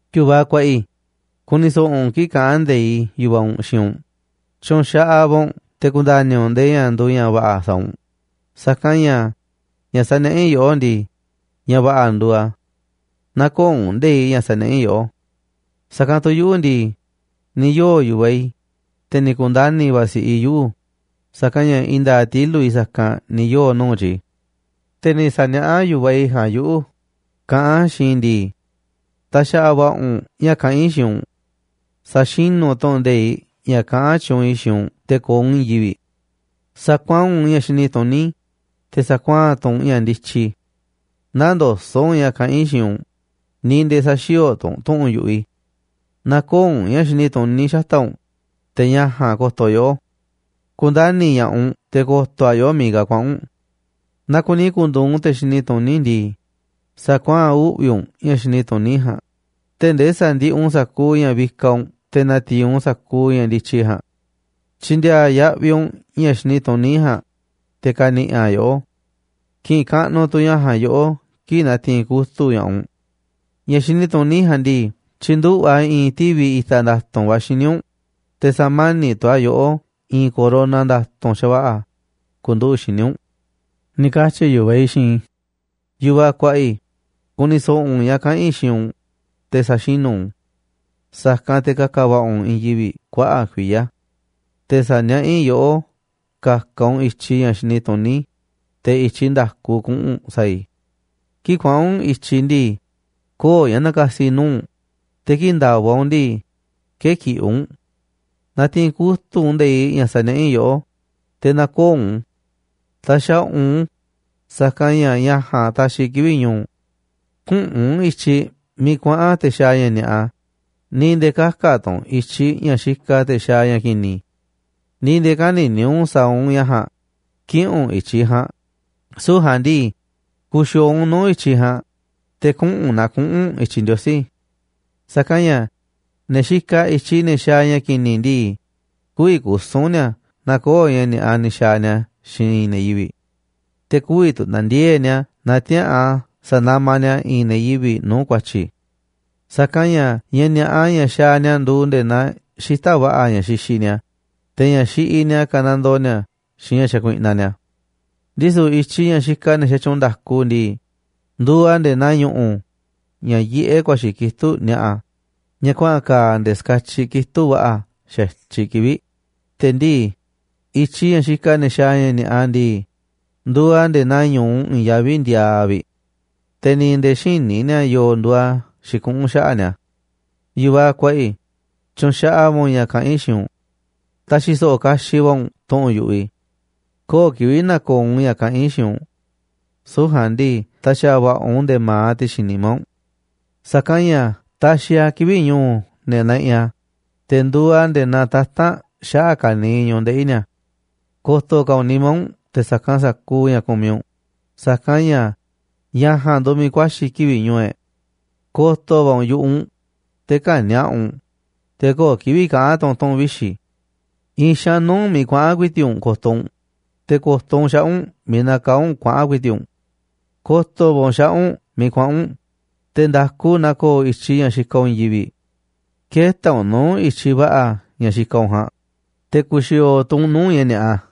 Yu̱vaꞌ kuaꞌa i̱, ku̱ni̱ so̱ꞌo̱ u̱nꞌ kii̱ꞌ kaꞌán nde̱iꞌ yu̱vaꞌ u̱nꞌ xiinꞌ u̱nꞌ. Tyu̱nxaꞌaꞌ va̱ u̱nꞌ te̱ ku̱nda̱ni̱ u̱nꞌ ndee ña̱ nduuꞌ ña̱ va̱ꞌa̱ sa̱a̱ u̱nꞌ. Sa̱kanꞌ ña̱ ña̱ saniaꞌá i̱ yoꞌó ndii, ña̱ va̱ꞌa̱ nduuꞌ a̱. Nä̱ko̱o̱ u̱nꞌ nde̱iꞌ ña̱ saniaꞌá i̱ yoꞌó. Sa̱kanꞌ tu̱ yuꞌu̱ ndii, ni̱ yoo̱ yu̱vaꞌ i̱, te̱ ni̱ ku̱ndani̱ va̱ si̱ꞌiꞌ i̱ yuꞌu̱, sa̱kanꞌ ña̱ i̱i̱n nda̱a̱ꞌ tilu̱ꞌ i̱ sa̱kanꞌ ni̱ yoo̱ nuu̱ꞌ tyi̱. Te̱ ni̱ sa̱niaꞌá yu̱vaꞌ i̱ ja̱a̱nꞌ yuꞌu̱ kaꞌán a̱ xiinꞌ i̱ ndii: “Ta̱xa̱ꞌa̱ va̱ꞌa̱ u̱nꞌ ña̱ kaꞌán i̱ xiinꞌ u̱nꞌ. Sa̱xinu̱ u̱nꞌ tu̱ꞌu̱n nde̱iꞌ ña̱ kaꞌán tyuunꞌ i̱ xiinꞌ u̱nꞌ te̱ ko̱o̱ u̱nꞌ i̱i̱n yivi̱ꞌ. Sa̱kuaa̱n u̱nꞌ ña̱ xini tuní, te̱ sa̱kuaa̱n tu̱ u̱nꞌ ña̱ ndityi. Nä̱ndoso̱ꞌ u̱nꞌ ña̱ kaꞌán i̱ xiinꞌ u̱nꞌ, ni̱ nde̱e̱ sä̱xi̱o̱o̱ tu̱ u̱nꞌ tu̱ꞌu̱n yu̱ꞌuꞌ i̱. Nä̱ko̱o̱ u̱nꞌ ña̱ xini tuní xata̱ꞌ u̱nꞌ, te̱ ña̱ ja̱a̱nꞌ ko̱to̱ yoꞌó. Ku̱ndani̱ ña̱ꞌaꞌ u̱nꞌ te̱ ko̱to̱ a̱ yoꞌó miiꞌ ka̱ kuaꞌa̱n u̱nꞌ. Naaꞌ kuni ku̱ndu̱u̱ u̱nꞌ te̱ xini tuní ndii, sa̱kuaa̱n uꞌvi̱ u̱nꞌ ña̱ xini tuní ja̱a̱nꞌ, tee̱ꞌ ndee sa̱ndiꞌiꞌ u̱nꞌ sa̱kuuꞌ ña̱ vikaꞌ u̱nꞌ te̱ na̱ti̱i̱n u̱nꞌ sa̱kuuꞌ ña̱ ndityi ja̱a̱nꞌ. Tyi̱ndi̱a̱a̱ yaꞌviꞌ u̱nꞌ ña̱ xini tuní ja̱a̱nꞌ, te̱ ka̱ni̱ꞌi̱ a̱ yoꞌó. Ki̱ꞌi̱n kaꞌnuꞌ tu̱ ña̱ ja̱a̱nꞌ yoꞌó kii̱ꞌ na̱ti̱i̱n kutu̱ꞌ ña̱ꞌaꞌ u̱nꞌ. Ña̱ xini tuní ja̱a̱nꞌ ndii, tyi̱nduꞌu̱ꞌ a̱ i̱i̱n tivi̱ i̱ta̱ nda̱tu̱nꞌ va̱ xíniꞌ u̱nꞌ, te̱ sa̱mani̱ꞌ tu̱ a̱ yoꞌó i̱i̱n corona nda̱tu̱nꞌ xa̱va̱ꞌa̱ ku̱nduꞌu̱ꞌ xíniꞌ u̱nꞌ”, ni̱ katyi̱ yu̱vaꞌ i̱ xiinꞌ i̱. Yu̱vaꞌ kuaꞌa i̱, ku̱ni̱ so̱ꞌo̱ u̱nꞌ ña̱ kaꞌa̱n i̱ xiinꞌ u̱nꞌ, te̱ sa̱xinu̱ u̱nꞌ u̱n. Sa̱kanꞌ te̱ ka̱ka̱ va̱ꞌa̱ u̱nꞌ i̱i̱n yivi̱ꞌ kuaꞌa̱ꞌ kuiya̱. Te̱ sa̱niaꞌá i̱ yoꞌó ka̱ka̱ u̱nꞌ i̱tyiꞌ ña̱ xini tuní, te̱ i̱tyiꞌ nda̱ku kuꞌu̱n u̱nꞌ sa̱a̱ i̱. Kii̱ꞌ kuaꞌa̱n u̱nꞌ i̱tyiꞌ ndii, köo̱ꞌ ña̱ na̱ka̱si̱ nuu̱ꞌ u̱nꞌ, te̱ kii̱ꞌ nda̱va̱ u̱nꞌ ndii, kë̱kiꞌi̱ u̱nꞌ. Na̱ti̱i̱n kutu̱ꞌ u̱nꞌ nde̱iꞌ ña̱ saniaꞌá i̱ yoꞌó, te̱ nä̱ko̱o̱ u̱nꞌ u̱n. Ta̱xa̱ꞌa̱ u̱nꞌ u̱n, sa̱kanꞌ ña̱ ña̱ ja̱a̱nꞌ taxiꞌ kivi̱ꞌ ñu̱u̱ u̱nꞌ. Küꞌu̱n u̱nꞌ i̱tyiꞌ miiꞌ kuaꞌa̱n te̱ xaaꞌ ña̱ ni̱a̱ꞌa, ni̱ nde̱e̱ kä̱ka̱ tu̱ u̱nꞌ i̱tyiꞌ ña̱ xikaꞌ te̱ xaaꞌ ña̱ ki̱ni̱. Ni̱ nde̱e̱ kä̱ni̱ni̱ u̱nꞌ sa̱a̱ u̱nꞌ ña̱ ja̱a̱nꞌ, kï̱ꞌi̱n u̱nꞌ i̱tyiꞌ ja̱a̱nꞌ. Süu̱ꞌ ja̱a̱nꞌ ndii, ku̱xi̱o̱o̱ u̱nꞌ nuu̱ꞌ i̱tyiꞌ ja̱a̱nꞌ, te̱ kuꞌu̱n naa kuꞌu̱n u̱nꞌ i̱tyiꞌ Ndiosí. Sa̱kanꞌ ña̱ ne̱ xikaꞌ i̱tyiꞌ ne̱ xaaꞌ ña̱ ki̱ni̱ ndii, kü̱vi̱ kusu̱n ni̱a̱ naaꞌ köo̱ꞌ ña̱ ni̱a̱ꞌa ni̱ xa̱a̱ ni̱a̱ xiinꞌ i̱i̱n ne̱ yivi̱ꞌ. Te̱ kü̱vi̱ tu̱ na̱ndiee̱ꞌ ni̱a̱ naaꞌ tiäa̱ꞌan sa̱namaꞌ ni̱a̱ i̱i̱n ne̱ yivi̱ꞌ nuu̱ꞌ ku̱a̱tyi̱. Sa̱kanꞌ ña̱ ña̱ ni̱a̱ꞌa ña̱ xaaꞌ ni̱a̱ nduuꞌ nde̱e̱ naa xita̱ꞌ va̱ꞌa̱ ña̱ xixiꞌ ni̱a̱, te̱ ña̱ xiꞌiꞌ ni̱a̱ kanandoo ni̱a̱ xiinꞌ ña̱ xakuiꞌnaꞌ ni̱a̱. Ndisu̱ i̱tyiꞌ ña̱ xikaꞌ ne̱ xatyuunꞌ nda̱ku ndii, nduuꞌ a̱ nde̱e̱ naa ñu̱ꞌu̱ ña̱ yiꞌé ku̱a̱xi̱ kitúꞌ ni̱a̱ꞌa̱, ña̱ kuaꞌa̱n ka̱a̱ nde̱e̱ ska̱tyiꞌ kitúꞌ va̱ꞌa̱ xa̱tyiꞌ kivi̱ꞌ. Te̱ ndii̱, i̱tyiꞌ ña̱ xikaꞌ ne̱ xaaꞌ ña̱ ni̱a̱ꞌa ndii, nduuꞌ a̱ nde̱e̱ naa ñu̱u i̱i̱n yaví ndiaaꞌ vi̱ꞌ. Te̱ ni̱ nde̱e̱ xïní ni̱a̱ yo̱o̱ nduuꞌ a̱ xikuꞌún xaꞌa̱ꞌ ni̱a̱. Yu̱vaꞌ kuaꞌa i̱, tyu̱nxaꞌaꞌ va̱ u̱nꞌ ña̱ kaꞌán i̱ xiinꞌ u̱nꞌ. Ta̱xi̱ so̱ꞌo̱ kaxiꞌ va̱ u̱nꞌ tu̱ꞌu̱n yu̱ꞌuꞌ i̱. Köo̱ꞌ kivi̱ꞌ na̱ko̱o̱ u̱nꞌ ña̱ kaꞌán i̱ xiinꞌ u̱nꞌ. Süu̱ꞌ ja̱a̱nꞌ ndii, ta̱xa̱ꞌa̱ va̱ꞌa̱ u̱nꞌ nde̱e̱ ma̱aꞌ ti̱xi̱n nimá u̱nꞌ. Sa̱kanꞌ ña̱ taxiꞌ a̱ kivi̱ꞌ ñu̱u̱ ne̱ naꞌiꞌ a̱, te̱ nduuꞌ a̱ nde̱e̱ naa tata̱nꞌ xaꞌa̱ꞌ ka̱niiꞌ ñu̱ꞌuꞌ ndeꞌi̱ ni̱a̱. Ko̱to̱ ka̱ u̱nꞌ nimá u̱nꞌ te̱ sa̱kanꞌ sa̱kuuꞌ ña̱ kumiꞌ u̱nꞌ, sa̱kanꞌ ña̱ ña̱ ja̱a̱nꞌ nduuꞌ miiꞌ ku̱a̱xi̱ kivi̱ꞌ ñu̱u̱ e̱ꞌ. Ko̱to̱ va̱ u̱nꞌ yu̱ꞌuꞌ u̱nꞌ, te̱ kä̱ni̱a̱ꞌa u̱nꞌ, te̱ köo̱ꞌ kivi̱ꞌ kaꞌa̱n tu̱ u̱nꞌ tu̱ꞌu̱n vixi̱. I̱i̱n xaanꞌ nuu̱ꞌ u̱nꞌ miiꞌ kuaꞌa̱n ku̱i̱ti̱ꞌ u̱nꞌ ko̱to̱ u̱nꞌ, te̱ ko̱to̱ u̱nꞌ xaꞌa̱ꞌ u̱nꞌ miiꞌ nakaá u̱nꞌ kuaꞌa̱n ku̱i̱ti̱ꞌ u̱nꞌ. Ko̱to̱ va̱ u̱nꞌ xaꞌa̱ꞌ u̱nꞌ miiꞌ kuaꞌa̱n u̱nꞌ, te̱ nda̱ku na ko̱o̱ i̱tyiꞌ ña̱ xikaꞌ u̱nꞌ i̱i̱n yivi̱ꞌ. Kë̱ta̱ u̱nꞌ nuu̱ꞌ i̱tyiꞌ va̱ꞌa̱ ña̱ xikaꞌ u̱nꞌ ja̱a̱nꞌ, te̱ ku̱xi̱o̱o̱ tu̱ u̱nꞌ nuu̱ꞌ ña̱ ni̱a̱ꞌa.